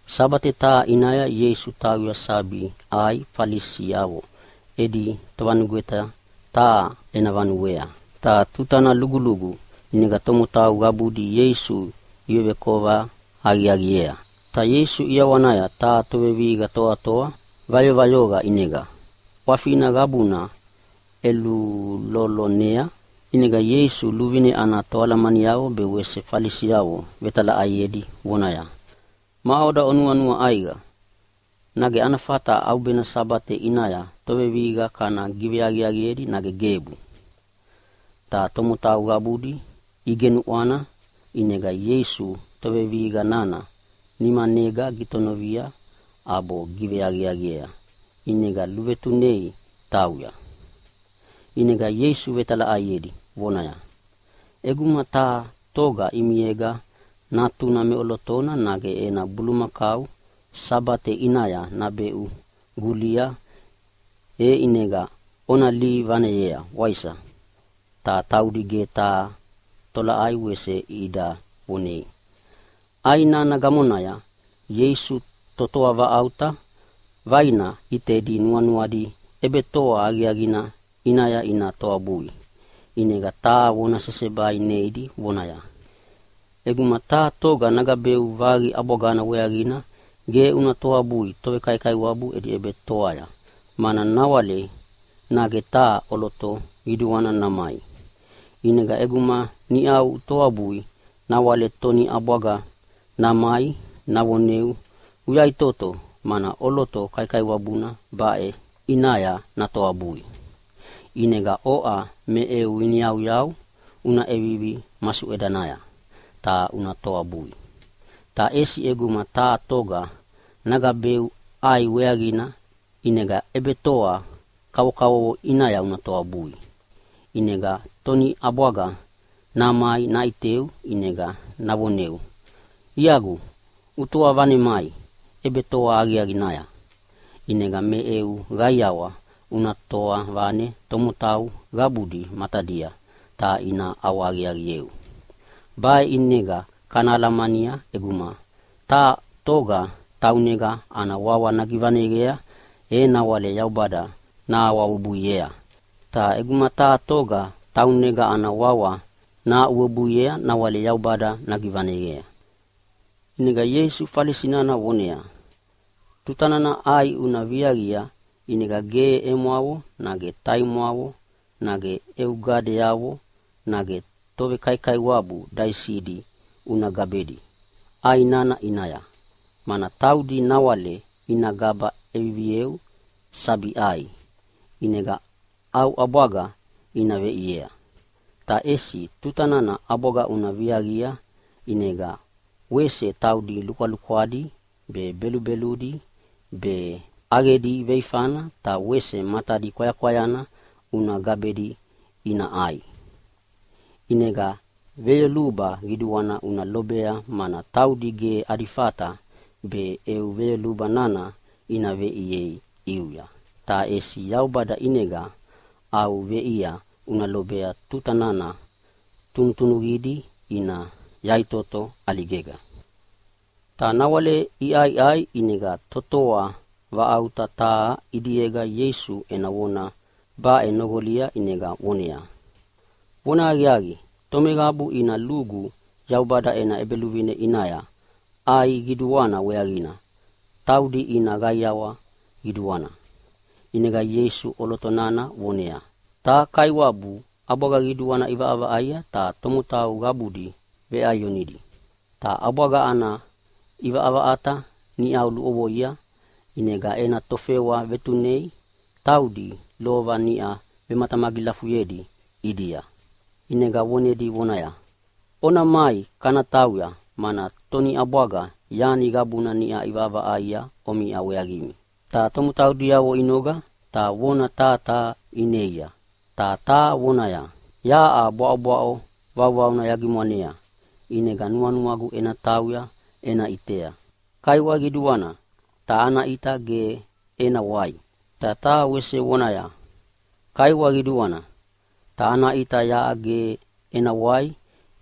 Sabate taha ʼinaya Ieisu tauya sabi ʼai Falisiavo edi tovanugweta taha ena vanuea. Ta tutana lugulugu ʼinega tomotau qabudi Ieisu ivevekova aqiaqiea. Ta Ieisu ʼiawanaya taha tovevihiqa toatoa vayovayoqa ʼinega ʼwafina qabuna ʼelulolonea. ʼInega Ieisu luvine ana toalamaniavo be Falisiavo vetalaʼaiedi vonedia, “Maʼoda onuanua ʼaiqa, nage ana fata ʼaubena Sabate ʼinaya tovevihiqa kana giveaqiaqiedi nage gebu?” Ta tomotau qabudi igenuʼwana, ʼinega Ieisu tovevihiqa nana nimanega gitonovia ʼabo giveaqiaqiea, ʼinega luvetunei tauya. ʼInega Ieisu vetalaʼaiedi vonaya, “ʼEguma taha toga ʼimiega natuna meʼolotona nage ena bulumakau Sabate ʼinaya nabeʼu gulia e ʼinega ona lihi vaneyea, waisa?” Ta taudi ge taha tolaʼai wese ida vonei. ʼAi nana gamonaya Ieisu totoa vaʼauta vaina ʼitedi nuanuadi ʼebetoa aqiaqina ʼinaya ina toabui, ʼinega taha vona sesebai neidi vonaya, “ʼEguma taha toga nagabeu vaqi ʼabwagana weaqina ge una toabui tovekaikaiwabu edi ʼebetoaya, mana nawale nage taha ʼoloto qiduana namai. ʼInega ʼeguma niʼa utoabui nawale toniʼabwaga namai navoneu, ‘Uyaʼitoto mana ʼoloto kaikaiwabuna baʼe ʼinaya natoabui!’ ʼInega oʼa me eu iniyauyau una ʼevivi masuʼedanaya ta una toabui. Ta ʼesi ʼeguma taha toga nagabeu ʼai weaqina, ʼinega ʼebetoa kavokavovo ʼinaya una toabui, ʼinega toniʼabwaga namai naʼiteu ʼinega navoneu, ‘Iagu, utoa vanemai ʼebetoa aqiaqinaya.’ ʼInega me eu qaiawa una toa vane tomotau qabudi matadia ta ina ʼawahaqiaqieu. Baʼe ʼinega kana alamania, ʼeguma taha toga taunega ana wawa nagivaneqea e nawale Yaubada nahaʼuwebuiea, ta ʼeguma taha toga taunega ana wawa nahaʼuwebuiea nawale Yaubada nagivaneqea.” ʼInega Ieisu Falisi nana voneaya, “Tutana ʼai una viaqia ʼinega ge emwavo nage taimwavo nage eu gadeavo nage tovekaikaiwabu daisidi una gabedi ʼai nana ʼinaya, mana taudi nawale ina gaba ʼevivieu sabi ʼai, ʼinega au ʼabwaga ina veʼiea. Ta ʼesi tuta nana ʼabwaga una viaqia ʼinega wese taudi lukwalukwadi be, belubeludi be, ʼaqedi veifana ta wese matadi kwayakwayana una gabedi ina ʼai. ʼInega veyoluba qiduana una lobea, mana taudi ge adi fata be eu veyoluba nana ina veʼiei ʼiuya, ta ʼesi Yaubada ʼinega au veʼia una lobea tuta nana tunutunuqidi ina yaʼitoto ʼaligega.” Ta nawale iʼaiʼai ʼinega totoa vaʼauta taha ʼidiega Ieisu ena vona baʼe noqolia ʼinega voneaya, “Vonahaqiaqi, tomeqabu ina lugu Yaubada ena ʼEbeluvine ʼinaya ʼai qiduana weaqina taudi ina qaiawa qiduana.” ʼInega Ieisu ʼoloto nana voneaya, “Taha kaiwabu ʼabwaga qiduana ʼivaʼavaʼaia ta tomotau qabudi veʼaionidi. Ta ʼabwaga ana ʼivaʼavaʼata niʼa luʼovoia, ʼinega ena tofewa vetunea taudi lova niʼa vematamagilafuyedi ʼidia, ʼinega vonedi vonaya, ‘Ona mai kana tauya, mana toniʼabwaga yani qabuna niʼa ʼivaʼavaʼaia omiʼa weaqimi!’ Ta tomotau diavona inoga ta vona taha taha ineia, ta taha vonaya, ‘Yaʼa bwaʼobwaʼo vauvauna yagimwanea, ʼinega nuanuagu ena tauya ena ʼitea. Kaiwa qiduana, ta ana ʼita ge ena wai.’ Ta taha wese vonaya, ‘Kaiwa qiduana, ta ana ʼita yaʼa ge ena wai,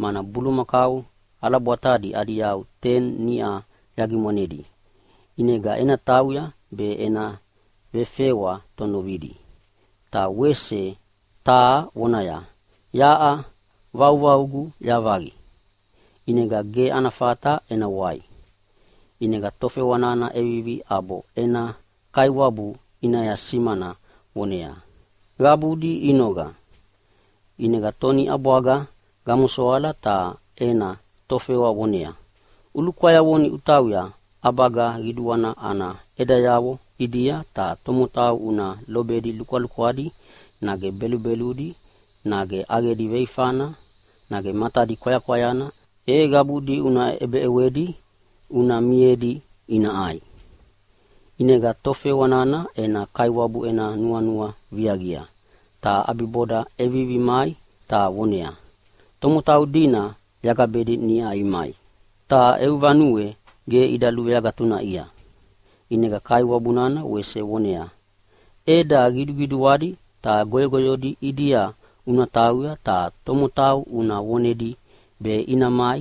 mana bulumakau ʼalabwatadi adi yau teni niʼa yagimwanedi, ʼinega yatautauya be ena vefewa tonovidi.’ Ta wese taha vonaya, ‘Yaʼa vauvaugu yavaqi ʼinega ge ana fata ena wai.’ “ʼInega tofewa nana ʼevivi ʼabo ena kaiwabu ʼinaya simana voneaya, ‘Qabudi inoga.’ ʼInega toniʼabwaga gamosoala ta ena tofewa voneaya, ‘Ulukwayavoni utauya ʼabaga qiduana ana ʼedayavo ʼidia be tomotau una lobedi lukwalukwadi nage belubeludi nage ʼaqedi veifana nage matadi kwayakwayana e qabudi una ʼebeʼewedi una miedi ina ʼai.’ ʼInega tofewa nana ena kaiwabu ena nuanua viaqia, ta ʼabiboda ʼevivi mai ta voneaya, ‘Tomotau dina yagabedi niʼa imai, ta eu vanue ge ida luveagatunaʼia.’ ʼInega kaiwabu nana wese voneaya, ‘ʼEda qiduqiduadi ta goyogoyodi ʼidia una tauya ta tomotau una vonedi be ina mai,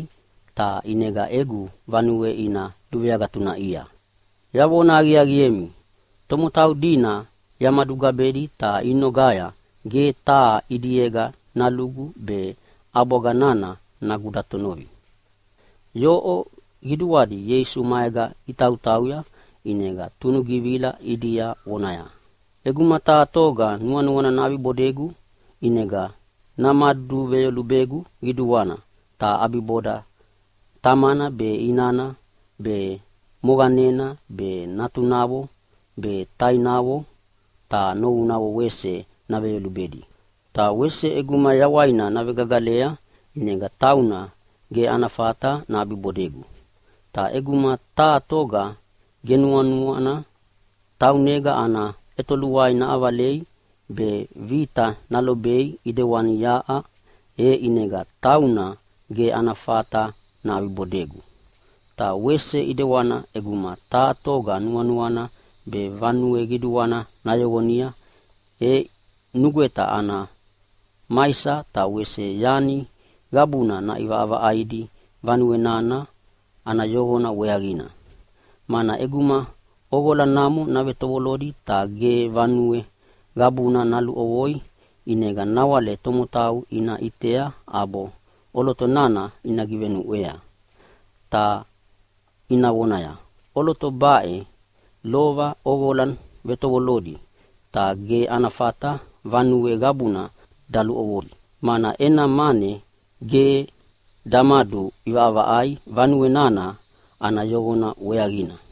ta ʼinega egu vanue ina luveagatunaʼia. Yavona aqiaqiemi, tomotau dina yamadugabedi ta inogaya ge taha ʼidiega nalugu be ʼabwaga nana nagudatonovi.’” Yoʼo qiduadi Ieisu maega itautauya, ʼinega tunugivila ʼidia vonaya, “ʼEguma taha toga nuanuana naʼabibodegu ʼinega namaduveyolubegu qiduana ta ʼabiboda tamana be, inana be, moqanena be, natunavo be, tainavo ta novunavo wese naveyolubedi. Ta wese ʼeguma yawaina navegagalea ʼinega tauna ge ana fata naʼabibodegu. Ta ʼeguma taha toga ge nuanuana taunega ana ʼetoluai naʼavalei be vita nalobei ʼidewana yaʼa, e ʼinega tauna ge ana fata naʼabibodegu. “Ta wese ʼedewana ʼeguma taha toga nuanuana be vanue qiduana nayoqonia, e nugweta ana maisa ta wese yani qabuna naʼivaʼavaʼaidi vanue nana ana yoqona weaqina. Mana ʼeguma ʼoqola namo navetovolodi ta ge vanue qabuna naluʼovoi, ʼinega nawale tomotau ina ʼitea ʼabo ʼoloto nana ina givenuʼwea, ta ina vonaya, ‘ʼOloto baʼe lova ʼoqola ʼevetovolodi, ta ge ana fata vanue qabuna daluʼovoi, mana ena mane ge damaduʼivaʼavaʼaia vanue nana ana yoqona weaqina.’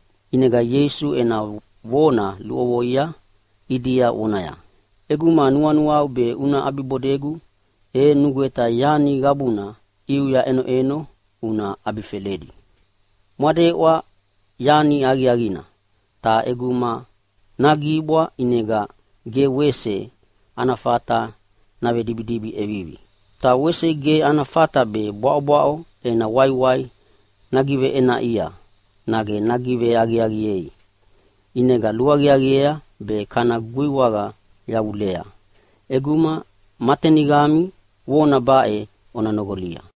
ʼInega Ieisu ena vona luʼovoia ʼidia vonaya, “ʼEguma nuanuau be una ʼabibodegu e nugweta yani qabuna ʼiuya ʼenoʼeno una ʼabifeledi.” “Mwadeʼwa yani aqiaqina, ta ʼeguma nagibwa ʼinega ge wese ana fata navedibidibi ʼevivi. Ta wese ge ana fata be bwaʼobwaʼo ena waiwai nagiveʼenaʼia nage nagiveaqiaqiei, ʼinega luaqiaqiea be kana guiwaqa yavulea. ʼEguma ma taniqami vona baʼe ona noqolia!”